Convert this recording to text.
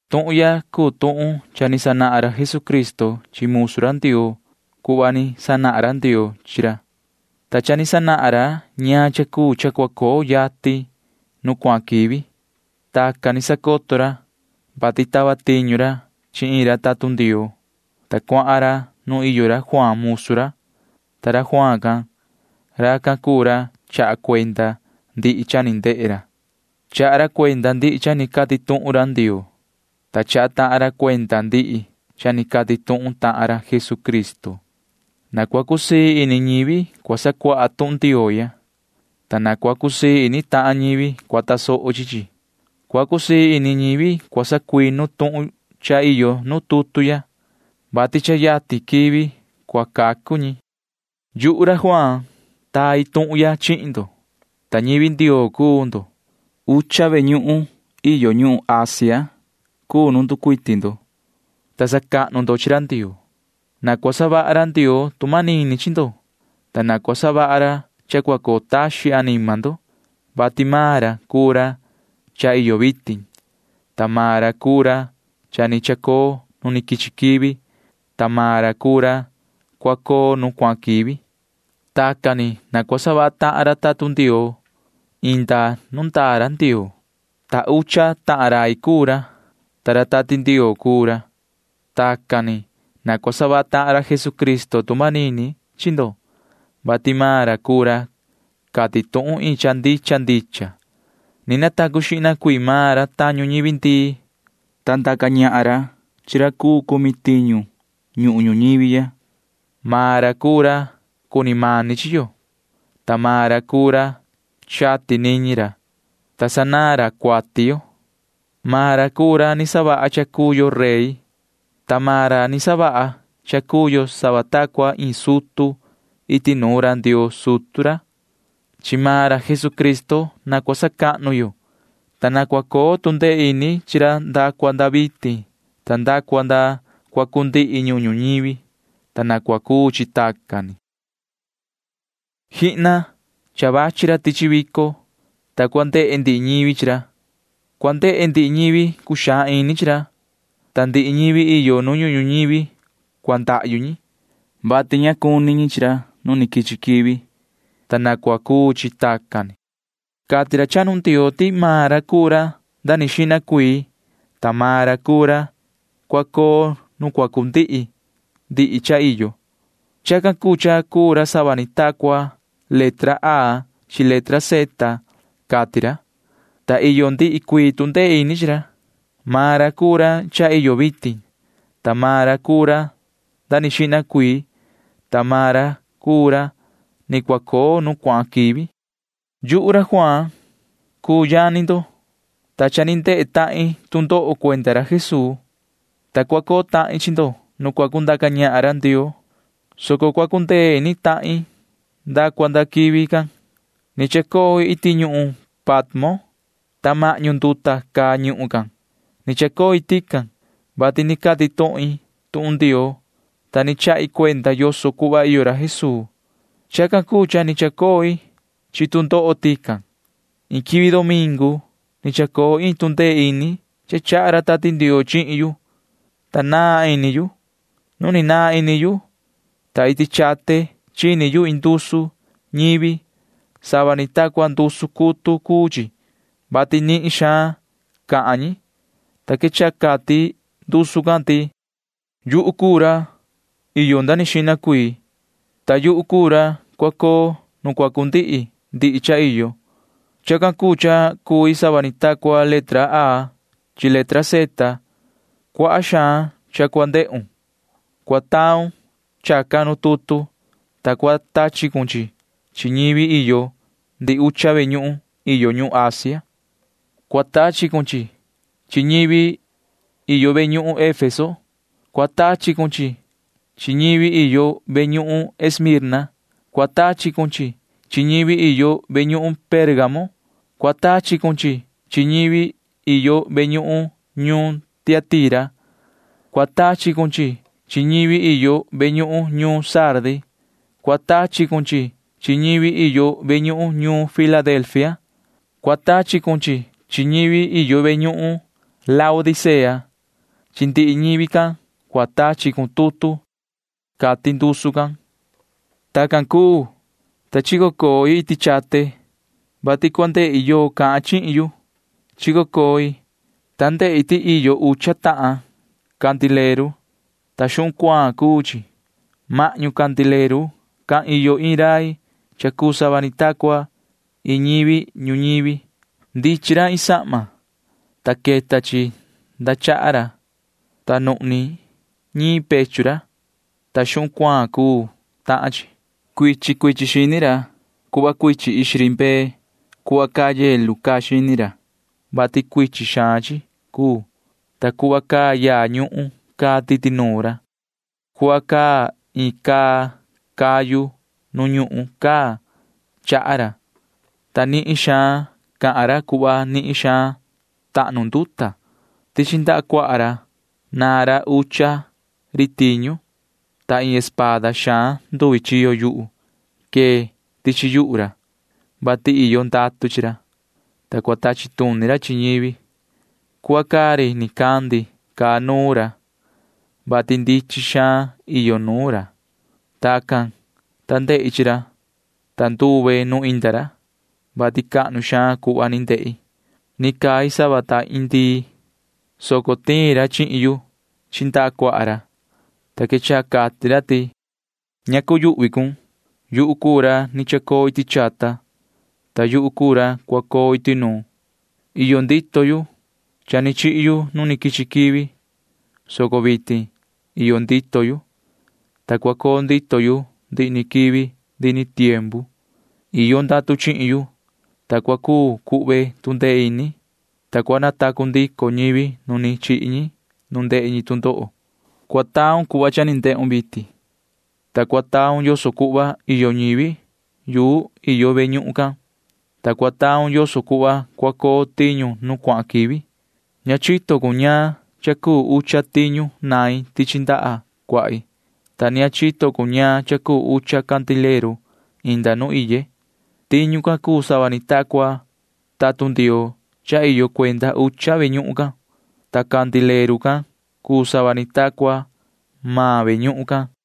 Tuhun ya cuu tuhun cha ni sanahan ra Jesucristo chi musu ra Ndioo cuhva ni sanahan ra Ndioo chi ra, ta cha ni sanahan ra ñaan cha cuu cha cua coo yatin nu cuahan quivi. Tacan ni sacoto ra, vati tava tiñu ra chi iin ra tatun Ndioo, ta cuahan ra nuun iyo ra Juaan musu ra, ta ra Juaan can―racan cuu ra chaha cuenda ndihi cha ni ndehe ra. Chaha ra cuenda ndihi cha ni cati tuhun ra Ndioo, ta chaha tahan ra cuenda ndihi cha ni cati tuhun tahan ra Jesucristo. Na cua cusii ini ñivi cua sacuaha tuhun Ndioo ya, ta na cua cusii ini tahan ñivi cua tasoho chi chi. Cua cusii ini ñivi cua sacuinu tuhun cha iyo nu tutu ya, vati cha yatin iyo quivi cua cacu ñi nu iyo ñi. Yuhu ra Juaan taa tuhun ya chihin ndo, ta ñivi Ndioo cuu ndo. Ucha ve ñuhun iyo ñuhun Asia cuu nu nducuiti ndo, ta sacahnu ndo chi ra Ndioo. Na cua savaha ra Ndioo tu manini chi ndo, ta na cua savaha ra cha cua coo taxin anima ndo, vati maan ra cuu ra cha iyo vitin, ta maan ra cuu ra cha ni chacoo nu quichi quivi, ta maan ra cuu ra cua coo nu cuahan quivi. Tacan ni na cua savaha tahan ra tatun Ndioo inda nu ndaa ra Ndioo, ta ucha tahan rai cuu ra, ta ra Tati Ndioo cuu ra. Tacan ni na cua savaha tahan ra Jesucristo tu manini chi ndo, vati maan ra cuu ra cati tuhun iin cha ndicha ndicha. Ni natacu xihna cuii maan ra tañu ñivi ndii, ta ndaca ñahan ra chi ra cuu cumi tiñu ñuhun ñuñivi ya. Maan ra cuu ra cuni mani chi yo, ta maan ra cuu ra chati niñi ra, ta sanaan ra cuati yo. Maan ra cuu ra ni savaha cha cuu yo rey, ta maan ra ni savaha cha cuu yo sava ta cua iin sutu iti nuun ra Ndioo sutu ra. Chi maan ra Jesucristo na cua sacahnu yo, ta na cua coo tu ndee ini chi ra nda cua nda vitin ta nda cua nda cua cundihi ñuhun ñuñivi, ta na cua cuu chi tacan ni. ¡Jihna! Cha vachi ra tichi vico, ta cua ndehe ndihi ñivi chi ra. Cua ndehe ndihi ñivi cuxaan ini chi ra, ta ndihi ñivi iyo nu ñuhun ñuñivi cua ndahyu ñi, [vati ña cuni ñi chi ra nu ni quichi quivi,] ta na cua cuu chi tacan ni. Cati ra chahnu Ndioo ti maan ra cuu ra nda ni xihna cuii, ta maan ra cuu ra cua coo nu cua cundihi ndihi cha iyo. Chacan cuu cha cuu ra sava ni ta cua letra A chi letra Z, cati ra, ta iyo ndihi cuii tu ndee ini chi ra. Maan ra cuu ra cha iyo vitin, ta maan ra cuu ra nda ni xihna cuii, ta maan ra cuu ra ni cua coo nu cuahan quivi. Yuhu ra Juaan cuu yani ndo, ta cha ni ndehe tahin tu ndoho cuenda ra Jesuu, ta cua coo tahin chi ndo nu cua cundaca ñahan ra Ndioo, soco cua cundee ini tahin nda cua nda quivi can. Ni chacoi iti ñuhun Patmo, ta mahñu nduta caa ñuhun can. Ni chacoi tican, vati ni cati tuhin tuhun Ndioo, ta ni chahi cuenda yoso cuhva iyo ra Jesuu. [Chacan cuu cha ni chacoi chi tu ndoho tican.] Iin quivi domingu ni chacoo iin tu ndee ini cha chaha ra Tati Ndioo chihin yu, ta naan ini yu. Nu ni naan ini yu, ta iti chate chini yu iin ndusu ñivi. Sava ni ta cua ndusu cutu cuu chi, vati nihin xaan cahan ñi, ta quechaha cati ndusu can ti: ―Yuhu cuu ra iyo nda ni xihna cuii, ta yuhu cuu ra cua coo nu cua cundihi ndihi cha iyo. Chacan cuu cha cui sava ni ta cua letra A chi letra Z. Cuaha xaan cha cua ndehun. Cua taun chacan nu tutu, ta cua tachi cun chi chi chi ñivi iyo ndihi ucha ve ñuhun iyo ñuhun Asia. Cua tachi cun chi chi chi ñivi iyo ve ñuhun ñuun Efeso. Cua tachi cun chi chi chi ñivi iyo ve ñuhun ñuun Esmirna. Cua tachi cun chi chi chi ñivi iyo ve ñuhun ñuun Pérgamo. Cua tachi cun chi chi chi ñivi iyo ve ñuhun ñuun Tiatira. Cua tachi cun chi chi chi ñivi iyo ve ñuhun ñuun Sardi. Cua tachi cun chi chi chi ñivi iyo ve ñuhun ñuun Filadelfia. Cua tachi cun chi chi chi ñivi iyo ve ñuhun ñuun Laodicea. Chi ndihi ñivi can cua tachi cun tutu ―cati ndusu can. Tacan cuu, ta chico coi iti chate, vati cua ndehi yoo cahan chihin yu. Chico coi, ta ndehi ti iyo ucha tahan candileru, ta xuhun cuaan cuu chi. Mahñu candileru can iyo iin rai cha cuu sava ni ta cua iin ñivi ñuñivi. Ndichin ra iin sahma, ta queta chi nda chaha ra, ta nuhni ñiin pechu ra, ta xuhun cuaan cuu tahan chi. Cuichin cuichin xini ra cuu cuhva cuichin ixi ri mbee. Cuhva caa nieve caa xini ra, vati cuichin xaan chi cuu, ta cuhva caa yaa ñuhun caa titi nuun ra. Cuhva caa iin caa cayu nu ñuhun caa chaha ra, ta nihin xaan cahan ra cuhva nihin xaan tahnu nduta. Tichi ndaha cuaha ra naan ra ucha ri tiñu, ta iin espada xaan nduvi chiyo yuhu quee tichi yuhu ra, vati iyo ndatu chi ra, ta cua tachi tuni ra chi ñivi. Cuhva caa ri nicandi caa nuun ra, vati ndichin xaan iyo nuun ra. Tacan, ta ndehi chi ra, ta nduve nu inda ra, vati cahnu xaan cuhva ni ndehi. Ni cai sava ta iin ndii, soco tiin ra chihin yu chi ndaha cuaha ra, ta quechaha cati ra ti: ―Ña cuyuhvi cun. Yuhu cuu ra ni chacoo iti chata, ta yuhu cuu ra cua coo iti nuun. Iyo ndito yu. Cha ni chihi yu nu ni quichi quivi, soco vitin iyo ndito yu, ta cua coo ndito yu ndihi ni quivi ndihi ni tiempu. Iyo ndatu chihin yu, ta cua cuu cuhve tu ndee ini, ta cua natacu ndico ñivi nu ni chihi ñi nu ndehe ñi tu ndoho. Cua taun cuhva cha ni ndehun vitin, ta cua taun yoso cuhva iyo ñivi yu iyo ve ñuhun can, ta cua taun yoso cuhva cua coo tiñu nu cuahan quivi. Ña chito cun ñaan cha cuu ucha tiñu nain tichi ndaha cuahi, ta ni ña chito cun ñaan cha cuu ucha candileru inda nu iye. Tiñu can cuu sava ni ta cua tatun Ndioo cha iyo cuenda ucha ve ñuhun can―ta candileru can cuu sava ni ta cua maan ve ñuhun can ―cati ra.